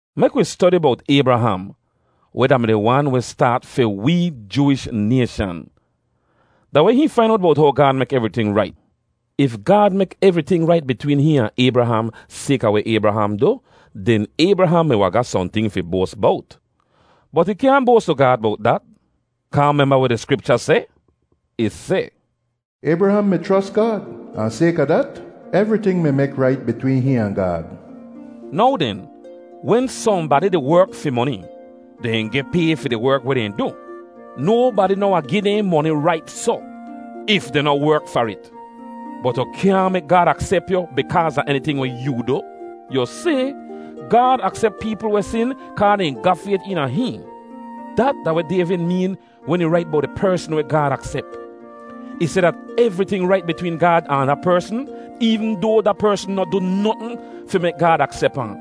Mek wi stodi bowt Aybraham, weh da-mi di wan weh staat fi wee Jooish nayshan. Da weh hihn fain owt bowt how Gaad mek evriting rait? If Gaad mek evriting rait bitween hihn ahn Aybraham sayka weh Aybraham du, den Aybraham mi wahn ga sohnting fi boas bowt. Bot ih kyaahn boas tu Gaad bowt dat; kaa memba weh di Skripcha seh? Ih seh, “Aybraham mi chros Gaad, ahn sayka dat, evriting mi mek rait bitween hihn ahn Gaad.” Now den, wen sohnbadi di werk fi moni, dehn geh pay fi di werk weh dehn du. Nobadi noh wahn gi dehn moni rait soh, if dehn noh werk far it. Bot yu kyaahn mek Gaad aksep yu bikaaz a eniting weh yoo du. Yu si, Gaad aksep peepl weh sin kaa dehn ga fayt eena hihn. Dat da weh Dayvid meen wen ih rait bowt di persn weh Gaad aksep. Ih seh dat evriting rait bitween Gaad ahn da persn, eevn doa da persn noh du notn fi mek Gaad aksep ahn,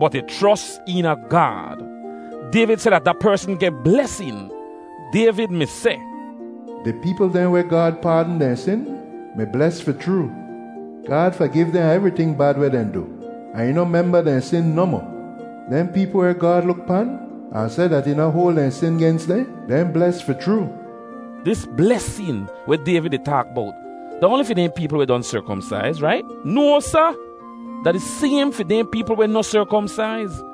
bot ih chros eena Gaad. Dayvid seh dat da persn geh blesin. Dayvid mi seh, “Di peepl dehn weh Gaad paadn dehn sin, mi bles fi chroo. Gaad fagiv dehn a evriting bad weh dehn du, ahn ih noh memba dehn sin nohmoh. Dehn peepl weh Gaad luk pan ahn seh dat ih noh hoal dehn sin gens dehn, dehn bles fi chroo.” Dis blesin weh Dayvid di taak bowt da oanli fi dehn peepl weh don serkomsaiz, rait? No, sa! Da di saym fi dehn peepl weh noh serkomsaiz.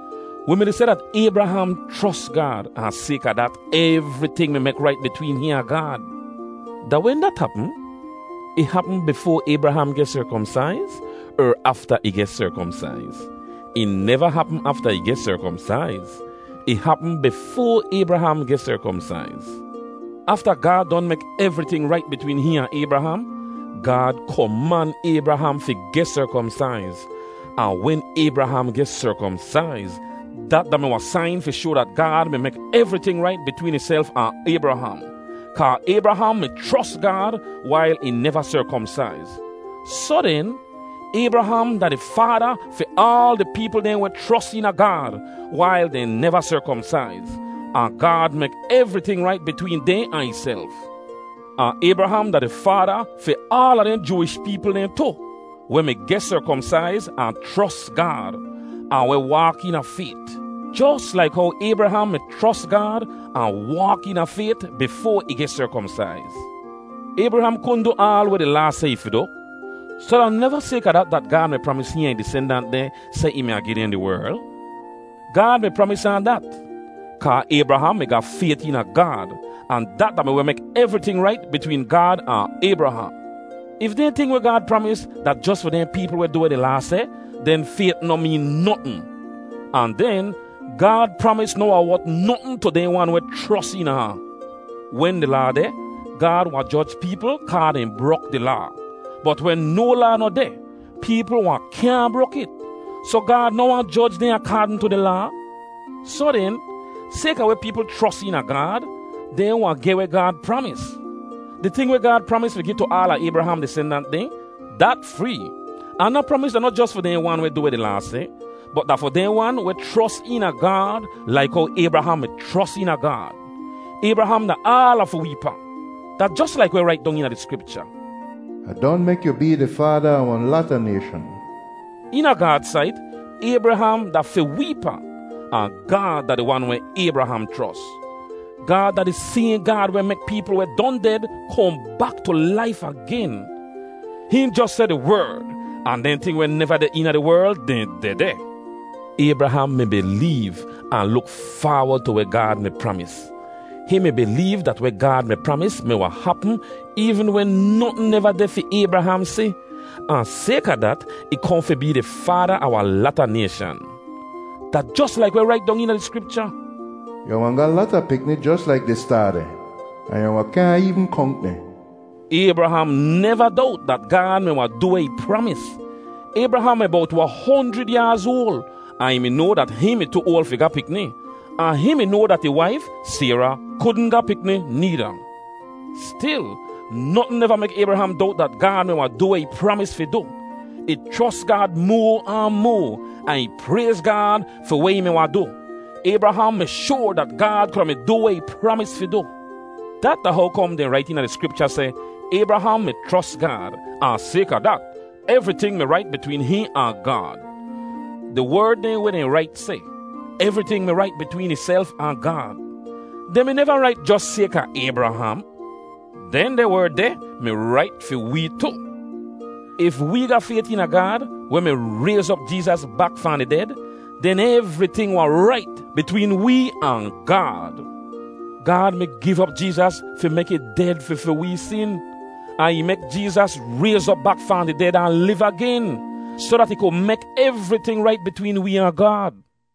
Wi mi-di seh dat Aybraham chros Gaad, ahn sayka dat, evriting mi mek rait bitween hihn ahn Gaad. Da wen dat hapm? Ih hapm bifoa Aybraham geh serkomsaiz, er afta ih geh serkomsaiz? Ih neva hapm afta ih geh serkomsaiz; ih hapm bifoa Aybraham geh serkomsaiz. Afta Gaad don mek evriting rait bitween hihn ahn Aybraham, Gaad koman Aybraham fi geh serkomsaiz. Ahn wen Aybraham geh serkomsaiz, dat da-mi wahn sain fi shoa dat Gaad mi mek evriting rait bitween ihself ahn Aybraham, kaa Aybraham mi chros Gaad wail ih neva serkomsaiz. Soh den, Aybraham da di faada fi aal di peepl dehn weh chros eena Gaad wail dehn neva serkomsaiz, ahn Gaad mek evriting rait bitween dehn ahn ihself. Ahn Aybraham da di faada fi aala dehn Jooish peepl dehn tu, weh mi geh serkomsaiz ahn chros Gaad, ahn weh waak eena fayt, jos laik how Aybraham mi chros Gaad ahn waak eena fayt bifoa ih geh serkomsaiz. Aybraham kudn du aal weh di Laa seh ih fi du, soh da neva sayka dat dat Gaad mi pramis hihn ahn ih disendant dehn seh ih mi wahn gi dehn di werl. Gaad mi pramis ahn dat, kaa Aybraham mi ga fayt eena Gaad, ahn dat da-mi weh mek evriting rait bitween Gaad ahn Aybraham. If dehn ting weh Gaad pramis da jos fi dehn peepl weh du weh di Laa seh, den fayt noh meen notn. Ahn den Gaad pramis noh wahn wot notn tu dehn wan weh chros eena ahn. Wen di Laa deh, Gaad wahn joj peepl kaa dehn brok di Laa. Bot wen no Laa noh deh, peepl wahn kyaahn brok it, soh Gaad noh wahn joj dehn akaadn tu di Laa. Soh den, sayka weh peepl chros eena Gaad, dehn wahn geh weh Gaad pramis. Di ting weh Gaad pramis fi gi tu aala Aybraham disendant dehn, dat free, ahn da pramis da noh jos fi dehn wan weh du weh di Laa seh, bot da fi dehn wan weh chros eena Gaad laik how Aybraham mi chros eena Gaad. Aybraham da aala fi wee pa. Da jos laik weh rait dong eena di Skripcha, “Ah don mek yu bee di faada a wahn lata nayshan.” Eena Gaad sait, Aybraham da fi wee pa, ahn Gaad da di wan weh Aybraham chros. Gaad da di sayhn Gaad weh mek peepl weh don ded kohn bak tu laif agen. Hihn jos seh di werd ahn dehn ting weh neva deh eena di werl, dehn dehdeh. Aybraham mi bileev, ahn luk faawod tu weh Gaad mi pramis. Hihn mi bileev dat weh Gaad mi pramis mi wahn hapm eevn wen notn neva deh fi Aybraham si, ahn sayka dat, ih kohn fi bee di faada a wahn lata nayshan. Da jos laik weh rait dong eena di Skripcha, “Yu wahn ga lata pikni jos laik di staar dehn, ahn yu wahn kyaahn eevn konk dehn.” Aybraham neva dowt dat Gaad mi wahn du weh ih pramis. Aybraham mi bowt wahn honjrid yaaz oal, ahn ih mi noa dat hihn mi tu oal fi ga pikni, ahn hihn mi noa dat ih waif, Sayra, kudn ga pikni needa. Stil, notn neva mek Aybraham dowt dat Gaad mi wahn du weh ih mi pramis fi du. Ih chros Gaad moa ahn moa, ahn ih prayz Gaad fi weh ih mi wahn du. Aybraham mi shoar dat Gaad kuda mi du weh ih pramis fi du. Dat da how kom dehn rait eena di Skripcha seh, “Aybraham mi chros Gaad, ahn sayka dat, evriting mi rait bitween hihn ahn Gaad.” Di werd dehn weh dehn rait seh, “evriting mi rait bitween ihself ahn Gaad,” dehn mi neva rait jos sayka Aybraham. Dehndeh werd deh mi rait fi wee tu. If wee ga fayt eena Gaad, weh mi rayz op Jeezas bak fahn di ded, den evriting wahn rait bitween wee ahn Gaad. Gaad mi giv op Jeezas fi mek ih ded fi fi wee sin, ahn ih mek Jeezas rayz op bak fahn di ded ahn liv agen, soh dat ih ku mek evriting rait bitween wee ahn Gaad.